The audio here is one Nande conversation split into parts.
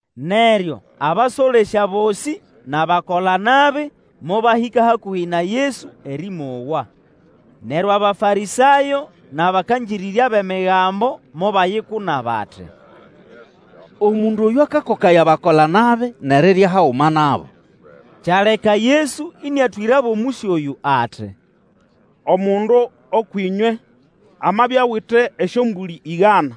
Neryo abasolesya bosĩ nʼabakolanabi mobahĩka hakũhĩ na Yesu erĩmowa. Neryo Abafarĩsayo nʼabakangĩrĩrya bʼEmigambo mobayikuna bati, Omundu oyũ akakokaya abakola-nabi nʼerirya haguma nabo. Kyaleka Yesu ĩnĩatwĩrabo omũsyo oyũ ati, Omundu ũkwʼĩnywe amabya awite esyombũlĩ ĩgana,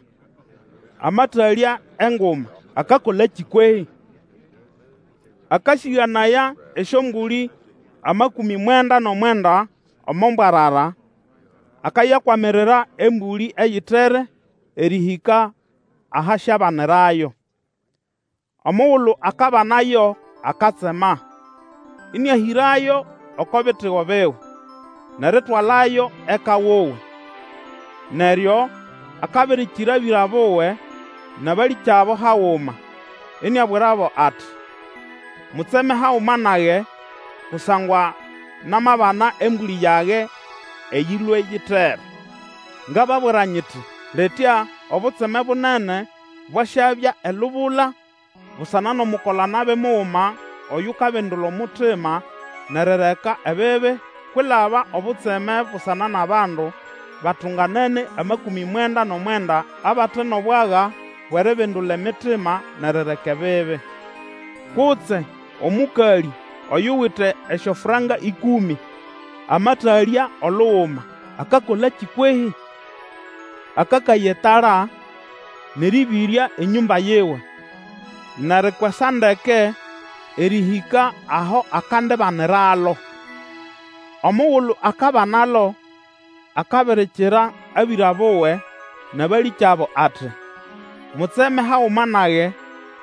amatalya enguma, akakolakĩ, kwehĩ? Akasĩganaya esyombũlĩ amakũmĩ mwenda nʼomwenda omo mbwarara, akayakwamirira embũlĩ eyitere erĩhĩka aho asyabanirayo. Omugulu akabanayo, akatsema, ĩnĩahĩrayo oko bitigo biwe, nʼeritwalayo eka wuwe. Neryo akabirikira bĩra buwe nʼabalĩkyabo haguma, iniabwirabo ati, Mutseme haguma nage, kusangwa namabana embũlĩ yage eyĩlwe yitere! Ngababwira nyiti, Litya obutseme bunene bwasyabya elubula busana nʼomukola-nabi muguma oyukabindula omutima nʼerireka ebibi kwilaba obutseme busana nʼabandu batunganene amakũmĩ mwenda nʼomwenda abate nʼobwaga bwʼeribindula emitima nʼerireka ebibi. Kutse omũkalĩ oyuwite esyofranka ĩkũmĩ amatalya oluguma, akakolakĩ kwehĩ? Akakaya etala, nʼerĩbĩrya enyũmba yiwe, nʼerikwesa ndeke erĩhĩka aho akandibaniralo. Omugulu akabanalo, akabirikira abĩra buwe nʼabalĩkyabo ati, Mutseme haguma nage,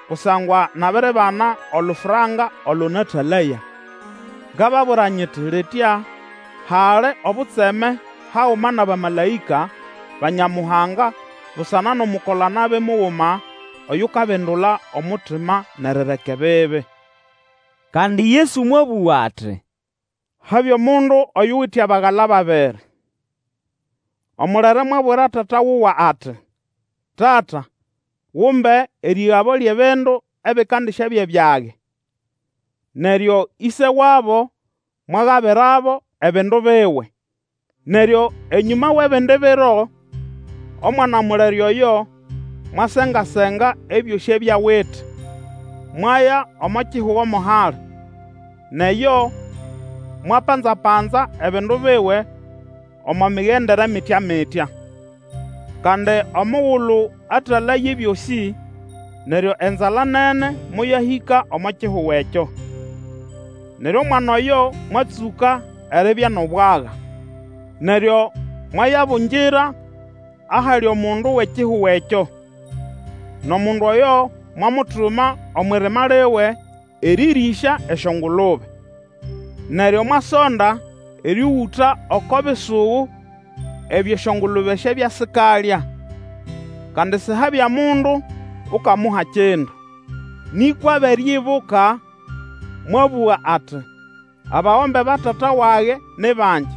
kusangwa nabiribana olufranka olo natalaya! Ngababwira nyiti litya hali obutseme haguma nʼabamalaĩka ba Nyamuhanga busana nʼomukola-nabi muguma oyukabindula omutima nʼerireka ebibi. Kandi Yesu mwabũga ati, Habya omundu oyuwite abagala babiri. Omulere mwabwira tata wuwe ati, Tata, gumbe erĩgabo lyʼebindu ebikandisyabya byage. Neryo ĩse wabo mwagabirabo ebindu biwe. Neryo enyũma wʼebindi biro, omwana mulere oyo mwasengasenga ebyosĩ abya awite, mwaya omo kihugo mo hali, nʼeyo mwapanza-panza ebindu biwe omo migendere mityamitya. Kandi omugulu atalaya ebyosĩ, neryo enzala nene moyahĩka omo kihugo ekyo. Neryo omwana oyo mwatsũka eribya nʼobwaga. Neryo mwayabungira ahali omundu wʼekihugo ekyo, nʼomundu oyo mwamutuma omwʼirima liwe erĩrĩsya esyongulube. Neryo mwasonda erĩũgũta oko bisugu ebyo esyongulube syabya sikalya, kandi sihabya mundu Ukamuha kindu. Nĩkwa abere ibuka, mwabũga ati, Abagombe ba tata wage ni bangi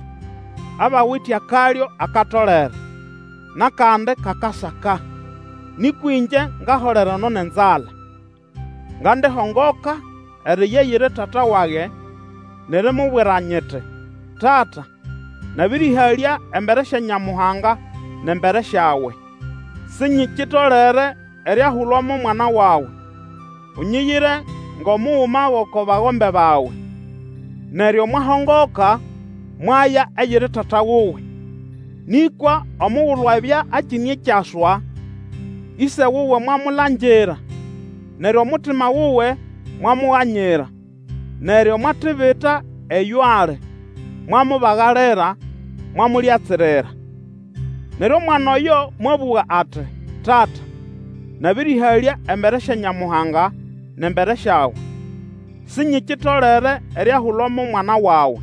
abawite akalyo akatolere, nʼakandi kakasaka, nĩkwa ĩngye ngaholera eno nʼenzala! Ngandihongoka eriya eyiri tata wage nʼerimubwira nyiti, Tata, nabĩrĩhalya embere sya Nyamuhanga nʼembere syawe. Sinyikitolere eriahulwa mo mwana wawe; unyiyire ngʼomuguma gʼoko bagombe bawe. Neryo mwahongoka mwaya eyiri tata wuwe. Nĩkwa omugulu abya akine ekyaswa, ĩse wuwe mwamulangira, neryo omutima wuwe mwamuganyira, neryo mwatibita eyo ali, mwamubagalira, mwamulyatsirira. Neryo omwana oyo mwabũga ati, Tata, nabĩrĩhalya embere sya Nyamuhanga nʼembere syawe; sinyikitolere eriahulwa mo mwana wawe.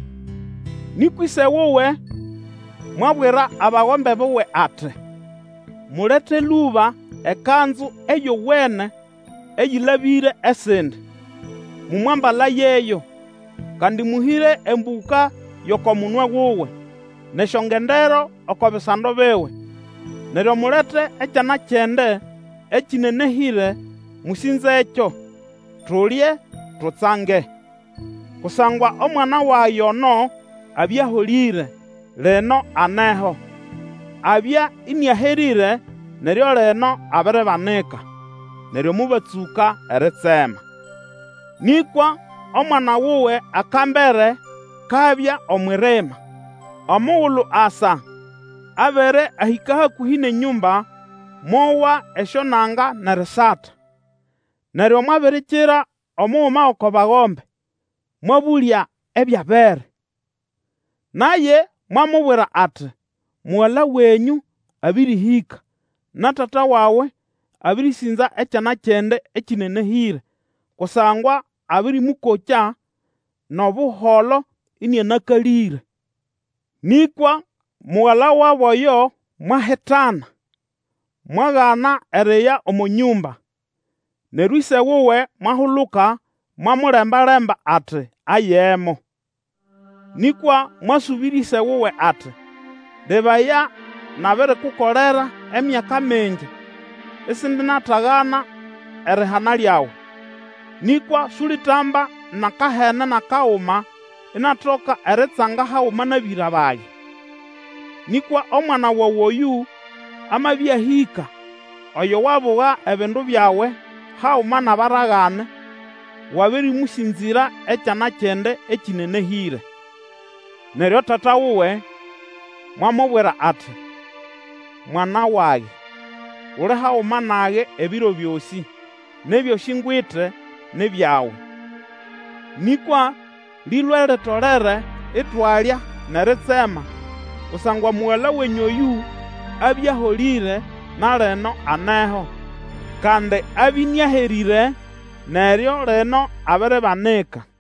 Nĩkwa ĩse wuwe mwabwira abagombe buwe ati, Mulete lũba ekanzu eyowene eyĩlabĩre esindi, mũmwambalayeyo, kandi mũhĩre embũka yʼoko munwe wuwe, nʼesyongendero oko bisando biwe. Neryo mulete ekyana kyʼende ekĩnenehĩre; mũsĩnzekyo, tulye, tutsange! Kusangwa omwana wage ono abya aholĩre, lino aneho; abya ĩnĩaherĩre, neryo lino abiribanika. Neryo mobatsũka eritsema. Nĩkwa omwana wuwe akambere, kabya omwʼirima. Omugulu asa, abere ahĩka hakũhi nʼenyũmba, mowa esyonanga nʼerisata. Neryo mwabirikira omuguma gʼoko bagombe, mwabũlya ebyabere. Naye mwamubwira ati, Mugala wenyũ abĩrĩhĩka, na tata wawe abĩrĩsĩnza ekyana kyʼende ekĩnenehĩre, kusangwa abĩrĩmũkokya nʼobuholo ĩnĩanakalĩre. Nĩkwa mugala wabo oyo mwahitana, mwagana eriya omo nyũmba. Neryo ĩse wuwe mwahuluka mwamulemba-lemba ati ayemo. Nĩkwa mwasũbĩrya ĩse wuwe ati, Lebaya, nabirikukolera emyaka mingi isindinatagana erihana lyawe. Nĩkwa sulitamba nʼakahene nʼakaguma inatoka eritsanga haguma nʼabĩra bage. Nĩkwa omwana wawe oyũ amabya ahĩka, oyo wabuga ebindu byawe haguma nʼabaragane, wabĩrĩmũsĩnzĩra ekyana kyʼende ekĩnenehĩre! Neryo tata wuwe mwamubwira ati, Mwana wage, uli haguma nage ebiro byosĩ, nʼebyosĩ ngwite ni byawe. Nĩkwa lĩwe litolere itwalya nʼeritsema, kusangwa mugala wenyũ oyũ abya aholĩre na lino aneho, kandi abya ĩnĩaherĩre, neryo lino abiribanika.